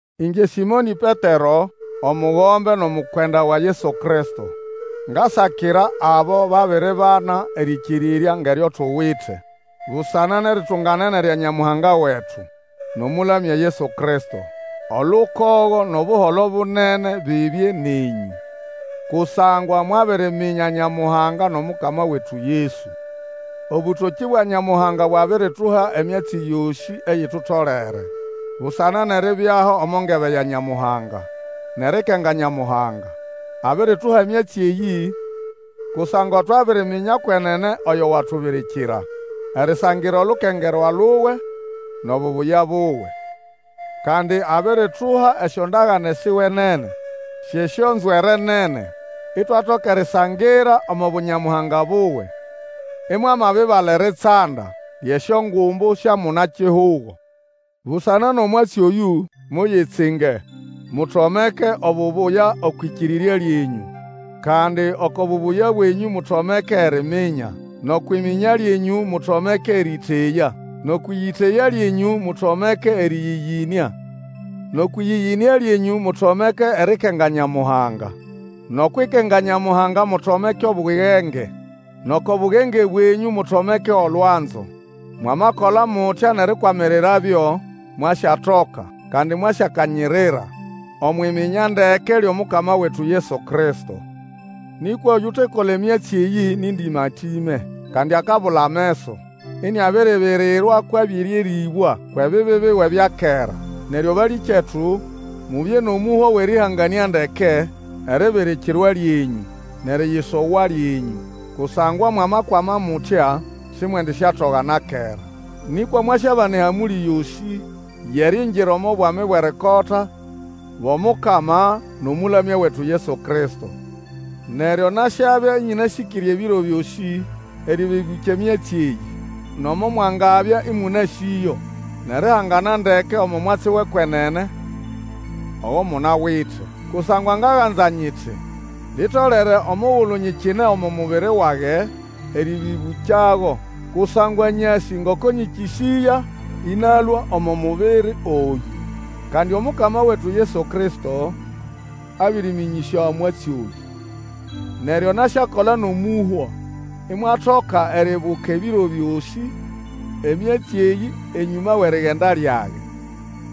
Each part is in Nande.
Ĩngye Sĩmonĩ Petero, omugombe nʼomukwenda wa Yesu Kristo, ngasakira abo babiribana erĩkĩrĩrya ngʼeryo tuwite busana nʼeritunganene lya Nyamuhanga wetu nʼomũlamya Yesu Kristo. Olukogo nʼobuholo bunene bibye nenyũ, kusangwa mwabiriminya Nyamuhanga nʼOmukama wetu Yesu. Obũtokĩ bwa Nyamuhanga bwabirituha emyatsi yosĩ eyitutolere, busana nʼeribyaho omo ngebe ya Nyamuhanga, nʼerikenga Nyamuhanga. Abirituha emyatsi eyĩ kusangwa twabiriminya kwenene oyo watubirikira erisangira olukengerwa luwe nʼobubuya buwe. Kandi abirituha esyondagane siwe nene, syʼesyonzwere nene, itwatoka erisangira omo bu Nyamuhanga buwe, imwamabibala eritsanda lyʼesyongumbu sya muna-kihugo. Busana nʼomwatsi oyũ, muyitsinge, mutomeke obubuya okwʼĩkĩrĩrya lyenyũ, kandi oko bubuya bwenyũ mutomeke eriminya; nʼokwʼiminya lyenyũ, mutomeke erĩyĩteya; nʼokwʼĩyĩteya lyenyũ mutomeke erĩyĩyĩnĩa; nʼokwʼĩyĩyĩnĩa lyenyũ mutomeke erikenga Nyamuhanga; nʼokwʼikenga Nyamuhanga mutomeke Obugenge, nʼoko bugenge bwenyũ mutomeke olwanzo. Mwamakola mutya nʼerikwamirirabyo, mwasyatoka, kandi mwasyakanyirira Omwʼiminya ndeke lyʼomukama wetu Yesu Kristo. Nĩkwa oyutekola emyatsi eyĩ nĩ ndĩma-tĩme, kandi akabula ameso, iniabiribirirwa kwʼabĩrĩerĩbwa kwʼebibi biwe bya kera. Neryo balĩkyetu, mubye nʼomũhwa wʼerĩhanganĩa ndeke eribirikirwa lyenyũ, nʼeriyisogwa lyenyũ, kusangwa mwamakwama mutya, simwendisyatoga na kera. Nĩkwa mwasyabana ehamũlĩ yosĩ yʼeriingira omo Bwami bwʼerikota bwʼomukama nʼomũlamya wetu Yesu Kristo. Neryo nasyabya ĩnyĩnasĩkĩre ebiro byosĩ erĩbĩbũkya emyatsi eyĩ, nomo mwangabya ĩmũnasĩyo nʼerihangana ndeke omo mwatsi wʼekwenene ogo munawite. Kusangwa ngaganza nyiti, litolere omugulu nyikine omo mubiri wage, erĩbĩbũkyago. Kusangwa nyasĩ ngoko nyĩkĩsĩya ĩnalũa omo mubiri oyũ. Kandi Omukama wetu Yesu Kristo, abĩrĩnyĩmĩnyĩsya omwatsi oyũ. Neryo nasyakola nʼomũhwa, imwatoka eryibuka ebiro byosĩ emyatsi eyĩ enyũma wʼerigenda lyage.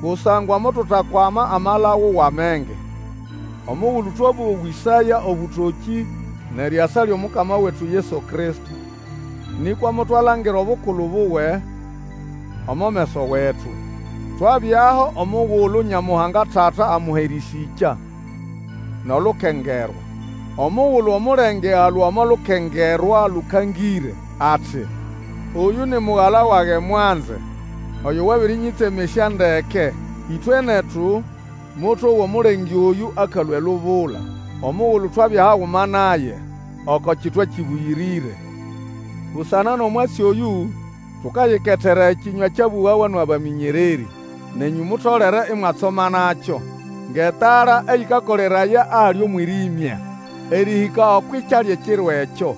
Kusangwa motutakwama amalagu wʼamenge omugulu twabowĩsaya obũtokĩ nʼeriasa lyʼomukama wetu Yesu Kristo, nĩkwa motwalangira obukulu buwe omo meso wetu. Twabyaho omugulu Nyamuhanga Tata amuha erĩsĩkya nʼolukengerwa, omugulu omulenge alũa omo Lukengerwa Lũkangĩre ati, Oyũ ni Mugala wage mwanze, oyo wabĩrĩnyĩtsemesya ndeke. Ĩtwe netu, motowa omulenge oyũ akalũa elubula, omugulu twabya haguma naye oko kitwa kĩbũyĩrĩre. Busana nʼomwatsi oyũ, tukayiketera ekĩnywa ekyabũgawa nʼabamĩnyererĩ. Nenyũ mutolere imwatsomanakyo ngʼetala eyĩkakoleraya ahali omwĩrĩmya, erĩhĩka okwʼikya lyʼeKiro ekyo,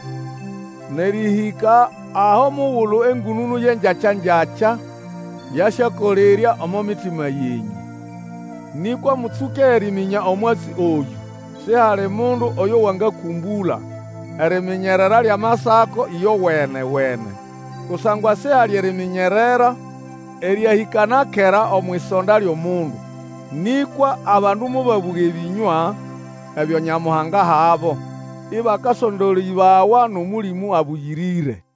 nʼerĩhĩka aho mugulu engũnũnũ yʼengyakya-ngyakya yasyakolerya omo mitima yenyũ. Nĩkwa mũtsũke eriminya omwatsi oyũ: Sihali mundu oyo wangakũmbũla eriminyerera lyʼamasako ĩyowene-wene. Kusangwa sihali eriminyerera eryahĩka na kera omwʼisonda lyʼomundu, nĩkwa abandu mobabũga ebĩnywa ebyo Nyamuhanga ahabo, ĩbakasondolĩbawa nʼOmũlĩmũ Abũyĩrĩre.